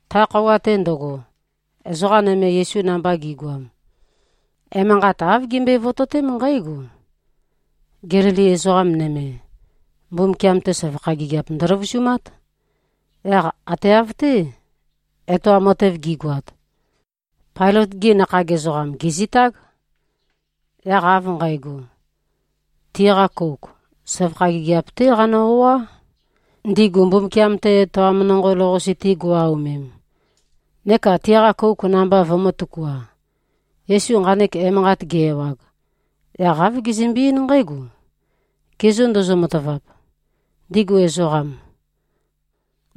Ta khøuwa-te ndøgo, ezoqa nøme Yesu namba gi꞉goam, emanqat āv gimbøe-vototém nqǽgo: Gelili ezoqa nøme, Mbumbukiam-te søvakha gigiap ndøløvusumát. Yaq ate av-té, etoam matev gi꞉goat, Pailøt-gi nakhag ezoqam, gèzitág. Yaq av nqægo, tiqa kouk, søvakha gigiap-té qanø-o꞉á, ndigu Mbumbukiam-te etoam nonqo lou-qase-te go꞉-aomem, neka tiqa kouk namba vømø̄-tøkua. Yesu nqanek emanqat ge-ewag, yaq āv gezømbe-eín nqǽgo, “Ge zô ndozo-matavap, ndigu ezoqam,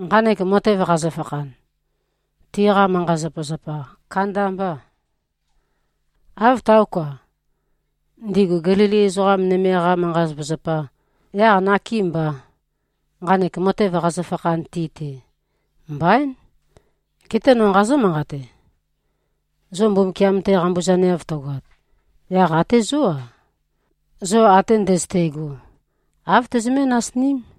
nqanek matev qazøfakhan, tiqa manqa-zapazapa kandambâ, áv táoka, ndigu Gelili ezoqa nøme-qa manqa-zapazapa? Yaq nakêmbà, nqanek matev qazøfakhan ti-te? Mbaín! Geté no nqazǿ-manqate: Zo Mbumbukiam-te qambuzaneav tøgoat, yaq até zó-a, zo ate ndøzøte꞉go, āv tøzømé-nasiním.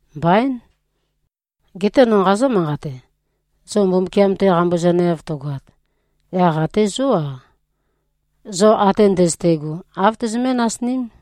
Mbaín! Geté no nqazǿ-manqate: Zo Mbumbukiam-te qambuzaneav tøgoat, yaq até zó-a, zo ate ndøzøte꞉go, āv tøzømé-nasiním.”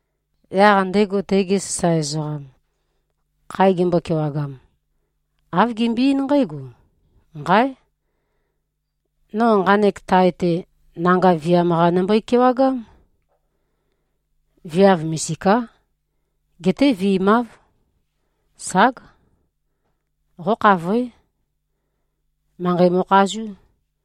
Yaq ndego tege sasae ezoqam, khae gembøe-kewagam, āv gembøe-eín nqǽgo, ‘Nqáe! No nqanek tae-te, nanga viam-qa nømbøe-kewagám. Viav misiká. Geté vi꞉máv. Ság! Qókhavoé. Manqei mo꞉khazú.’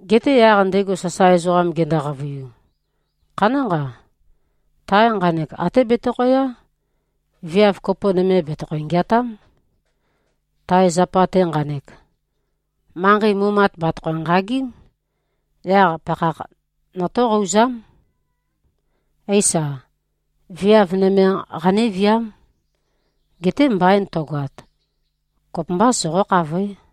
Geté yaq ndego sasae ezoqam gendo-qavøiu, ‘Khanánqa. Tae nqanek até betøkhæyá. Viav kopo nøme bètøkho-ngeatám. Tae zapa-te nqanek, manqei mumat bàtøkho-nqagím. Yaq pakhakh notóqouzám. Éisa, viáv nøme qanéviám. Geté mbain tøgoat, kopømbá. Soqó-khavoé.’”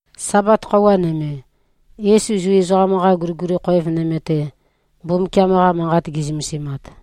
Sabat khøuwa nøme, Yesu Zu ezoqam-qa guliguli khoev nøme-te, Mbumbukiam-qa Manqat ge꞉zømesimat,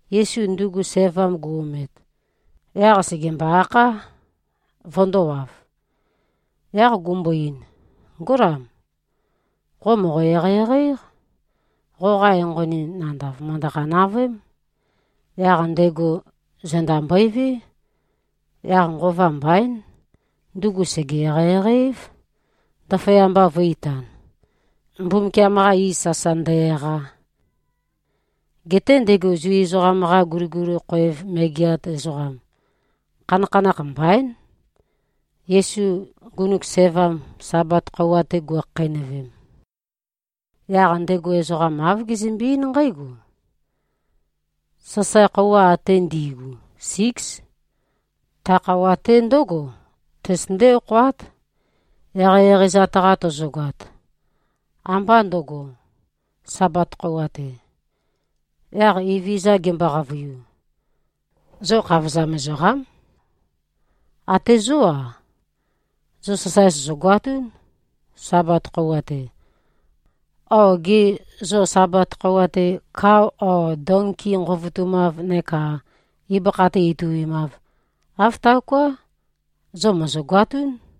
Yesu ndugu sævam gu-omet, yaq sègembo-akhá, vøndōwav, yaq gumbo-ein, “Ngólam, qo mòqo-eqeieqei-éq. Qoqa enqoni nandav, mø̀ndøqa-navøém.” Yaq ndego zenda mbøevé. Yaq nqova mbaín, ndugu sège-eqeieqei-év, ndaføyamba vø̄-itan, Mbumbukiam-qa iz sasa ndø-eqa. Geté ndego Zu ezoqam-qa guliguli khoev megeat ezoqam, khanakhanakh mbaín, Yesu ngunuk sævam, Sabat khøuwa-te guikhakheinøvem. Yaq ndego ezoqa āv gezømbe-eín nqǽgo, “Sasae khøuwa ate ndi꞉gu, síks. Ta khøuwa-te ndǿgo tøzøtøndé-okhoát, eqeieqeizat-qa tozogoat. Ambá ndøgo, Sabat khøuwa-te.” Yaq Evezøza gembo-qavøiu, “Zo khavozam ezoqám. Até zó-a, zo sasae sòzogoatún, Sabat khøuwa-te. O gê, zo Sabat khøuwa-te, kao o donki nqovotumâv, neka ibøkha-te ituimâv. Āv taoká. Zo mòzogoatún.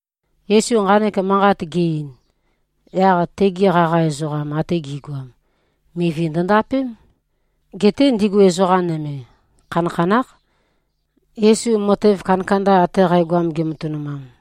Yesu nqanek manqat ge-ein, yaq tegi qaqa ezoqam ate gi꞉goam, mivi ndøndapém. Geté ndigu ezoqa nøme, khanakhanákh, Yesu matev kandakanda ate qægoam, gematønumam.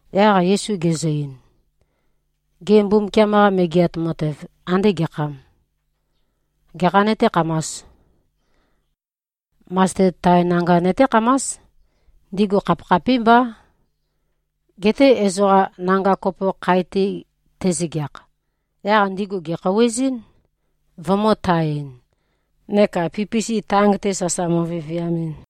Yaq Yesu gezø-ein, “Gê, Mbumbukiam-qa Megeat Matev ande gekhâm? Gekhā nøtékhamās? Masted tae nanga nøtékhamás. Ndigu khapikhapímbá. Geté ezoqa, nanga kopo khae-te tezøgeakh, yaq ndigu gèkhouwezɨ́n, vømø̄-tae-ɨn, neka pipisi tang-te sasa mo꞉viviamɨn.”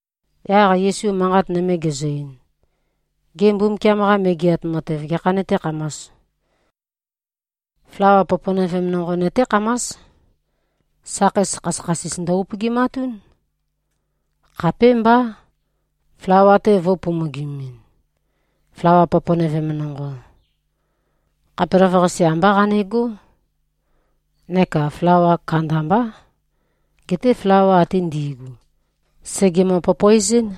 Yaq Yesu manqat nøme gezø-ein, “Gê, Mbumbukiam-qa Megeat Matev gekhā nøtékhamās? Flawa poponøvem nonqo nøtékhamás. Sakheis khasøkhasis ndø-upøgimatún, khapémbá, flawa-te vø̄u-pomogimimin. Flawa poponøvem nonqo, khapelavøqase ambá qanegó, neka flawa kandambā. Geté flawa ate ndi꞉gu, sègemø-popoezɨ́n.”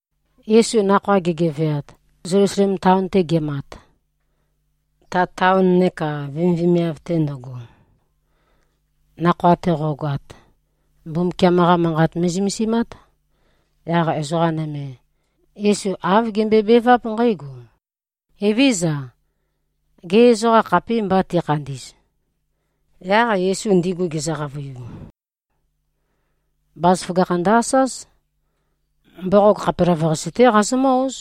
Yesu nakhoa gegeveat, Zelusalem taon-te gemat, ta taon neka vemivemiav-te ndøgo, nakhoa-te qo꞉goat, Mbumbukiam-qá manqat me꞉zømesimát. Yaq ezoqa nøme, Yesu āv gembøebeváp nqǽgo, “Evézøza. Gê, ezoqa khapîmbà, tikhandī꞉z?” Yaq Yesu ndigu gezø-qavøiu, “Bazaføgakh ndø-asáz. Mboqog khapelavøqasi-té qazomǿ-óz.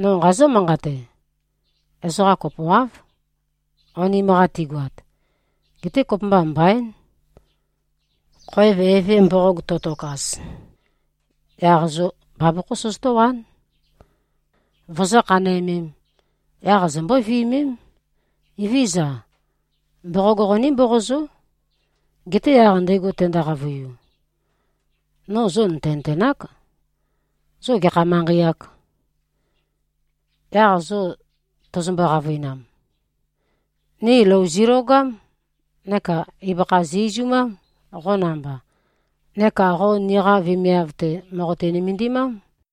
No nqazǿ-manqate. Ezoqa kopoáv, onim-qa tigoat. Geté kopømba mbaín. Khoev eve mboqog to꞉tokaz, yaq zo bavokhó sozotówán, vozó-khanæmēm. Yaq zombó-viømém, ‘Evézøza. Mboqog qoní-mboqozó!’ Geté yaq ndego tendo-qavøiu, ‘No zo nø̀tenøtenák. Zo gekha manqei-âk?’ Yaq zo tozombo-qavøinam, ‘Ni lou zilogám neka ibøkha zi-izumám, qo namba, neka qo niqa vemiav-te, mòqoti-nømendimám.’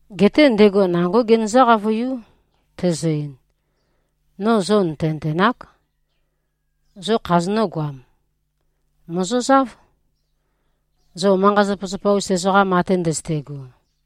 Geté ndego nangó genøzǿ-qavøiú, tezø-ein, ‘No zo nø̀tenøtenák. Zo khazonǿ-goam? Mòzozáv, zo manqa-zapazapa-us ezoqam ate ndøzøte꞉go.’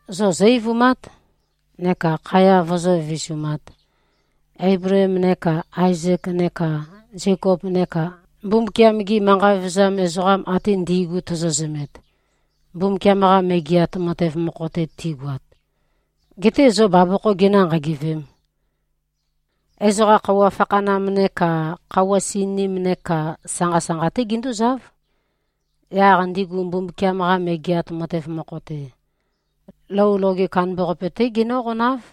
Zo zó-eivumát, neka khaya vozó-vivisumāt, Eibleem neka Aezek neka Zekop neka Mbumbukiam-gi manqa vevezam ezoqam ate ndi꞉gu tozo-zømet, Mbumbukiam-qa Megeat Matev mokho-te tigoat, getē zo bavokhō ginø̄-nqagevēm. Ezoqa khøuwa fakhanam neka khøuwa sininim neka sanqa-sanqa-té gindúzáv. Yaq ndigu Mbumbukiam-qa Megeat Matev mokho-te, lou loge kandambaqape-té genǿqonáv.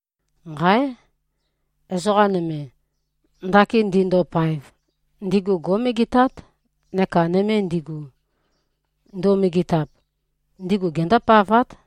Nqáe! Ezoqa nøme, ndakin ndindopaev, ndigu gó꞉megetát. Neka nøme ndigu, nduo-megetap, ndigu gendópavát.”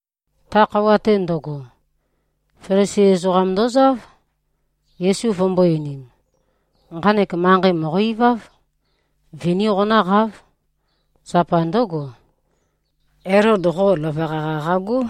Ta khøuwa-te ndøgo, Felisi ezoqam ndozáv, Yesu vømømbō-einim, “Nqanek manqei mòqo-iváv. Viní qonǿqáv. Zapa ndǿgo, Elod qo løvøqa-qa qagó.”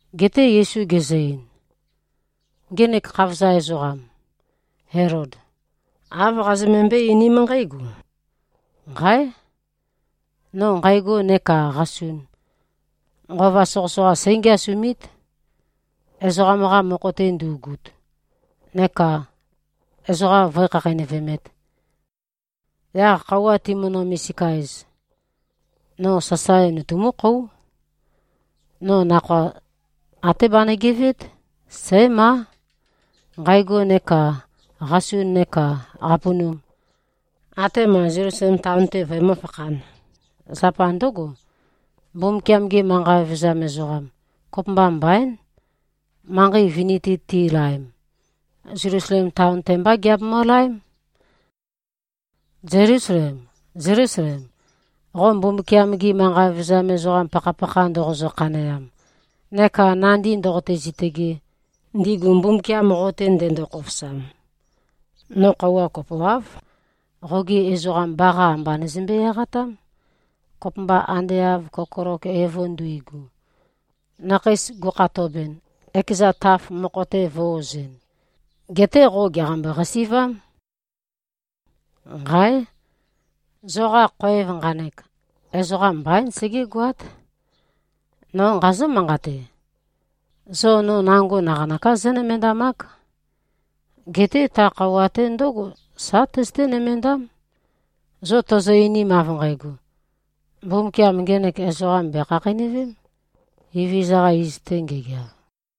Geté Yesu gezø-ein, “Ngenek khavozam ezoqam, Elod, āv qazømømbøé-einím nqǽgo, ‘Nqáe! No nqægo neka qasun, nqova soqøsoqa sǽngiasumít, ezoqam-qa mokho-te ndu꞉gut, neka ezoqa vǿe-khakheinøvemēt. Yaq khøuwa timønø-misika-ez, no sasae nutumúkhóu. No nakhoa até banø-geveét. Sǽmá, nqægo neka qasun neka qapunum, atema Zelusalem taon-te vøemǿ-fakhān. Zapa ndǿgo, Mbumbukiam-ge manqa vevezam ezoqam, kopømba mbaín, manqei vini-te tilaem. Zelusalem taon-te mbá giabemø-laém.’ Zelusalem, Zelusalem, qo Mbumbukiam-gi manqa vevezam ezoqam pakhapakha ndoqozø-khaneam, neka nandí ndōqōtē-zītø̄gē, ndigu Mbumbukiam qo-te ndendo-khofosam, no khøuwa kopoáv, qogi ezoqam baqa amba nøzømbe-eqatám, kopømba ande av kokolok evo nduigu, nakheis gukhatobɨn, ekeza taf mokho-te vø̄-ozɨn. Geté qo gèqambo-qasi꞉vám. Nqáe! Zoqa khoev nqanek, ezoqam mbaín, segégoát. No nqazǿ-manqate: Zo no nango naqanøká zónømendamák. Geté ta khøuwa-te ndǿgo, sa tøzøté-nømendám, zo tozo-einim, av nqægo, ‘Mbumbukiam ngenek ezoqam bèkhakheinøvém, Evezøza-qa iz-te ngegeav!’”